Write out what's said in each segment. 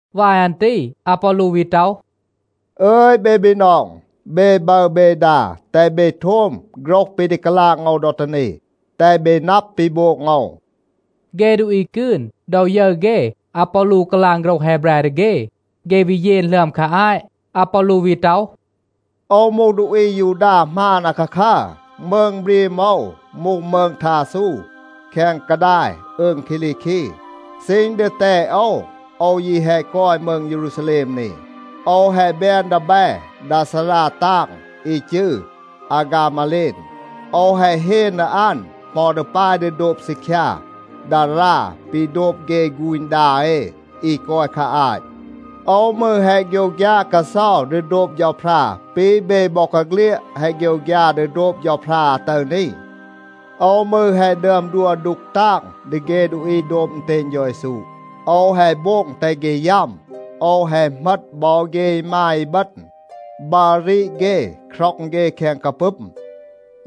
วาย อัน ตี อาปอลู วี ต็อห, “อึย เบ บีนอง, เบ บึร เบ ดา, แตห เบ โทม โฆรห ปี ดี กาลาง โอว ดอ ตี นี, แตห เบ นับ ปี โบง โอว.” เฆ ดูอี กืน, ดอ ยึร เฆ อาปอลู กาลาง โฆรห แฮแบร ดี เฆ, เฆ วี เยน หลึอม คา อาต. อาปอลู วี ต็อห, “โอว มูห ดูอี อายูดา หมาน อาคาคัร. มืง บรีม โอว มูห มืง ทาซู แคง กาดาย อืง คีลีคี. ซีณ ดีแตด โอว, โอว ยี แฮะ กอย มืง เยรูซาแลม นี. โอว แฮะ แบน ดีแบ ดา ซารา ตาง อี จืร อาฆามาเลน. โอว แฮะ เฮน ดี อัน, เหมา ดี ปาย ดี โดบ ซีคยา ดารา ปี โดบ เฆ ฆูณ ดา เอ อี กอย คา อาต. โอว มืร แฮะ โฆยวฆยา กาเซา ดี โดบ เฌาพรา ปี เบ บอกาเฆลียด แฮะ โฆยวฆยา ดี โดบ เฌาพรา อาตึร นี. โอว มืร แฮะ ดึอม ดัว ดูก ตาง ดี เฆ ดูอี โดบ อึณเตณ เฌา เยซู. โอว แฮะ โบง แตห เฆ ยัม. โอว แฮะ เหมต บอ เฆ อีมาย อีบึณ, บัร รีด เฆ, คร็อง เฆ แคง กาปึม.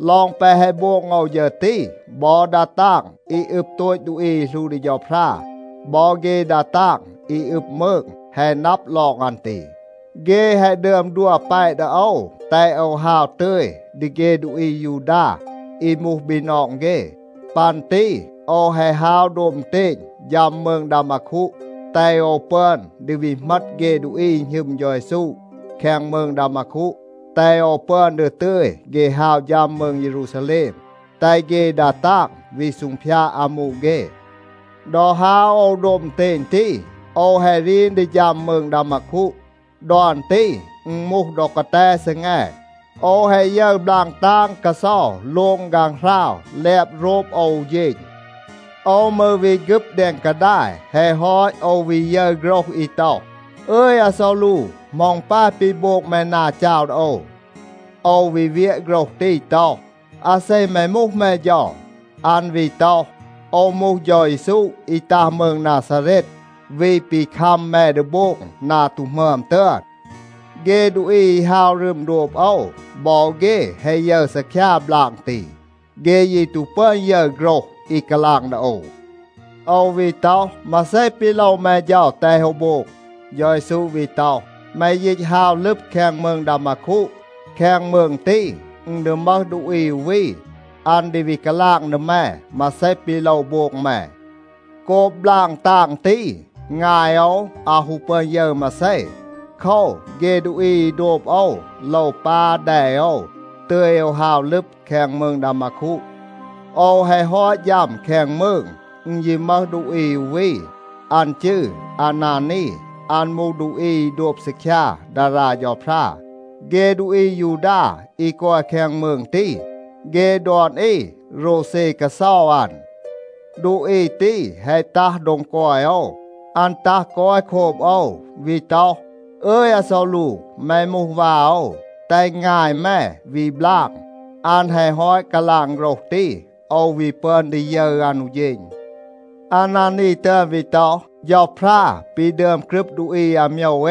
ลอง แปะ แฮะ โบง โอว ฌึร ตี, บอ ดา ตาง อี อึบ โตต ดูอี อี หลู ดี เฌาพรา บอ เฆ ดา ตาง อี อึบ มืง แฮะ นับ ลอง อัน ตี. เฆ แฮะ ดึอม ดัว แปะ ดี โอว, แตห โอว ฮาว ตึย ดี เฆ ดูอี อายูดา อี มูห บีนอง เฆ. ปัน ตี โอว แฮะ ฮาว โดบ อึณเตณ ฌัม มืง ดามาคู, แตห โอว ปึอน ดี วี เหมต เฆ ดูอี อี หณึม เฌา เยซู แคง มืง ดามาคู, แตห โอว ปึอน ดี ตึย เฆ ฮาว ฌัม มืง เยรูซาแลม, แตห เฆ ดา ตาง วี ซูงพยาด อามู เฆ. ดอ ฮาว โอว โดบ อึณเตณ ตี, โอว แฮะ รีน ดี ฌัม มืง ดามาคู. ดอ อัน ตี อึณ มูห ดอ กาแต ซีแง. โอว แฮะ ยึร บลาง ตาง กาเซา โลง ฆางหราว แลบ โรบ โอว อู เฌณ. โอว มืร วี ฆึบ แดง กาดาย. แฮะ ฮอต, โอว วี ยึร โฆรห อี ต็อห, ‘อึย, อาซอลู, เหมา อึณ ปาย ปี โบง แม นา จาว ดี โอว.’ โอว วี เวียะ โฆรห ตี ต็อห, ‘อาเซ แม มูห, แม เฌา?’ อัน วี ต็อห, ‘โอว มูห เฌา เยซู, อี ตัห มืง นาซาเรต, วี ปี คัม แม ดี โบง นา ตู หมึอม ตึอน.’ เฆ ดูอี อี ฮาว รึม โดบ โอว, บอ เฆ แฮะ ยึร ซีคยา บลาง ตี, เฆ ยี ตู ปึอน ยึร โฆรห อี กาลาง ดี โอว. โอว วี ต็อห, ‘มาเซ ปี โลว แม เฌา, แตห โอว โบง?’ เฌา เยซู วี ต็อห, ‘แม ยีต ฮาว ลึบ แคง มืง ดามาคู. แคง มืง ตี, อึณ ดี มึห ดูอี อู วี, อัน ดี วี กาลาง ดี แม มาเซ ปี โลว โบง แม.’ โกบ บลาง ตาง ตี, งาย โอว อาว ฮู ปึอน ยึร มาเซ. โคว, เฆ ดูอี อี โดบ โอว โลว ปา แด โอว, ตึย โอว ฮาว ลึบ แคง มืง ดามาคู. โอว แฮะ ฮอต ฌัม แคง มืง, อึณ ยี มึห ดูอี อู วี, อัน จืร อานานี. อัน มูห ดูอี อี โดบ ซีคยา ดารา เฌาพรา. เฆ ดูอี อายูดา อี กอย แคง มืง ตี, เฆ ดอน อี โรวเซ กาเซา อัน. ดูอี ตี แฮะ ตัห โดง กอย โอว. อัน ตัห กอย โคบ โอว, วี ต็อห, ‘อึย อาซอลู, แม มูห วา โอว. แตห งาย แม วี บลาง.’ อัน แฮะ ฮอต กาลาง โฆรห ตี, โอว วี ปึอน ดี ยึร อัน อู เฌณ. อานานี ตึอน วี ต็อห, ‘เฌาพรา ปี ดึอม กรึบ ดูอี อาโมยว เอ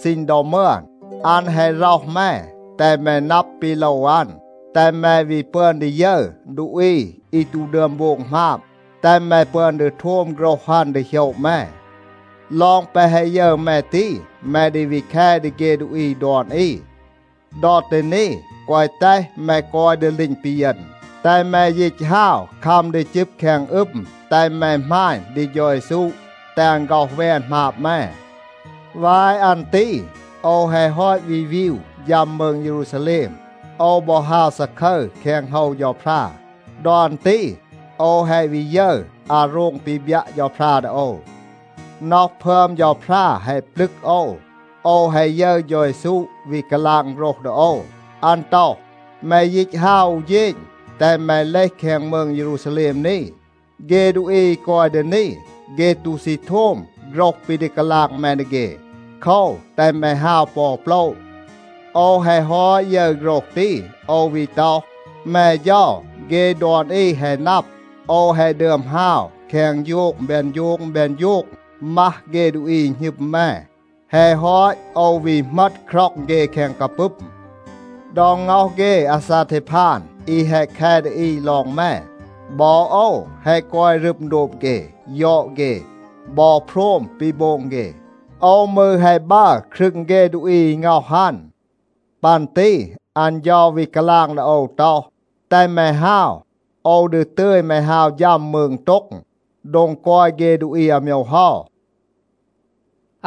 ซีณ ดอ มึอน, อัน แฮะ ร็อห แม, แตห แม นับ ปี โลว อัน, แตห แม วี ปึอน ดี ยึร ดูอี อี ตู ดึอม โบง หมาบ, แตห แม ปึอน ดี โทม โฆรห อัน ดี โหยะ แม. ลอง แปะ แฮะ ยึร แม ตี, แม ดี วี แค ดี เฆ ดูอี ดอน อี. ดอ ตี นี, แกวะ แตห แม กอย ดีลีณ ปีเยณ. แตห แม ยีต ฮาว, คัม ดี จึบ แคง อึม, แตห แม หมาณ ดี เฌา เยซู, แตห อัน ฆ็อห แวน หมาบ แม.’ วาย อัน ตี โอว แฮะ ฮอต วี วีว ฌัม มืง เยรูซาแลม, โอว บอ ฮาว ซาคึร แคง โฮว เฌาพรา. ดอ อัน ตี โอว แฮะ วี ยึร อาโรง ปี บยัะ เฌาพรา ดี โอว. น็อห พึอม เฌาพรา แฮะ ปลึก โอว. โอว แฮะ ยึร เฌา เยซู วี กาลาง โฆรห ดี โอว. อัน ต็อห, ‘แม ยีต ฮาว อู เฌณ, แตห แม เลห แคง มืง เยรูซาแลม นี. เฆ ดูอี อี กอย ดี นี, เฆ ตู ซี โทม โฆรห ปี ดี กาลาง แม ดี เฆ. โคว, แตห แม ฮาว ปอ อู โปละ.’ โอว แฮะ ฮอต ยึร โฆรห ตี, โอว วี ต็อห, ‘แม เฌา, เฆ ดอน อี แฮะ นับ, โอว แฮะ ดึอม ฮาว แคง โฌง แบน โฌง แบน โฌง มัห เฆ ดูอี หณึม แม. แฮะ ฮอต, โอว วี เหมต คร็อง เฆ แคง กาปึม. ดอ ง็อห เฆ อาซาเทพาน อี แฮะ แค ดี อี ลอง แม, บอ โอว แฮะ กอย รึม โดบ เฆ, ยอด เฆ, บอ โพรม ปี โบง เฆ. โอว มืร แฮะ บัร ครึง เฆ ดูอี อี ง็อห อัน.’ ปัน ตี อัน เฌา วี กาลาง ดี โอว ต็อห, ‘แตห แม ฮาว. โอว ดี ตึย แม ฮาว ฌัม มืง โต็ง, โดง กอย เฆ ดูอี อาโมยว เฮา.’”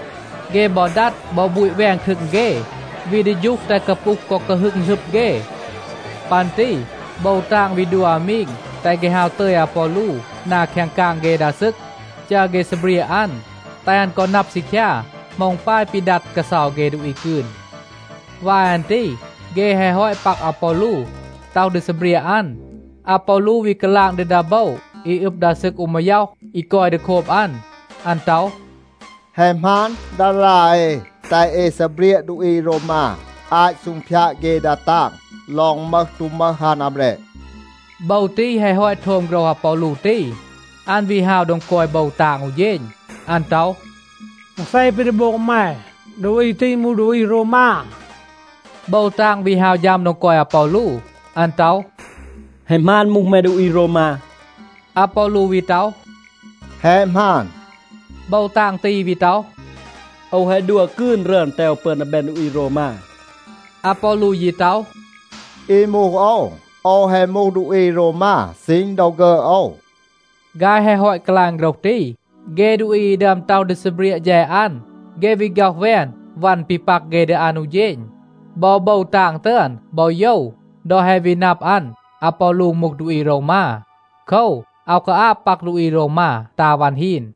เฆ บอ ดัด บอ บูต แวน ครึง เฆ, วี ดี ฌูห แตห กาปูห กอ กาฮึง หลึบ เฆ. ปัน ตี โบว ตาง วี ดัว อามีง, แตห เฆ ฮาว ตึย อาปอลู นา แคง กาง เฆ ดา ซึก, จัร เฆ ซีเบรียะ อัน, แตห อัน กอ นับ ซีคยา เหมา อึณ ปาย ปี ดัด กาเซา เฆ ดูอี กืน. วาย อัน ตี เฆ แฮะ ฮอต ปัก อาปอลู, ต็อห ดี ซีเบรียะ อัน, อาปอลู วี กาลาง ดี ดา โบว อี อึบ ดา ซึก อู มาย็อห, อี กอย ดี โคบ อัน. อัน ต็อห, “แฮะ หมาน ดารา เอ แตห เอ ซีเบรียะ ดูอี โรวมา อาต ซูงพยาด เฆ ดา ตาง ลอง มึห ตู มึห อัน อาแบรด?” โบว ตี แฮะ ฮอต โทม โฆรห อาปอลู ตี, อัน วี ฮาว โดง กอย โบว ตาง อู เฌณ. อัน ต็อห, “มาเซ ปี ดี โบง แม? ดูอี ตี มูห ดูอี โรวมา.” โบว ตาง วี ฮาว ฌัม โดง กอย อาปอลู. อัน ต็อห, “แฮะ หมาน มูห แม ดูอี โรวมา?” อาปอลู วี ต็อห, “แฮะ หมาน.” โบว ตาง ตี วี ต็อห, “โอว แฮะ ดัว กืน รึอน, แตห โอว ปึอน ดี แบน ดูอี โรวมา.” อาปอลู ยี ต็อห, “อี มูห โอว, โอว แฮะ มูห ดูอี โรวมา ซีณ ดอ ฆึอด โอว.” ฆาย แฮะ ฮอต กาลาง โฆรห ตี, เฆ ดูอี อี ดึอม ต็อห ดี ซีเบรียะ แฌด อัน, เฆ วี ฆ็อห แวน วัน ปี ปัก เฆ ดี อัน อู เฌณ. บอ โบว ตาง ตึอน บอ โยว ดอ แฮะ วี นับ อัน อาปอลู มูห ดูอี โรวมา. โคว, อาว กาอาบ ปัก ดูอี โรวมา ตา วัน ฮีน.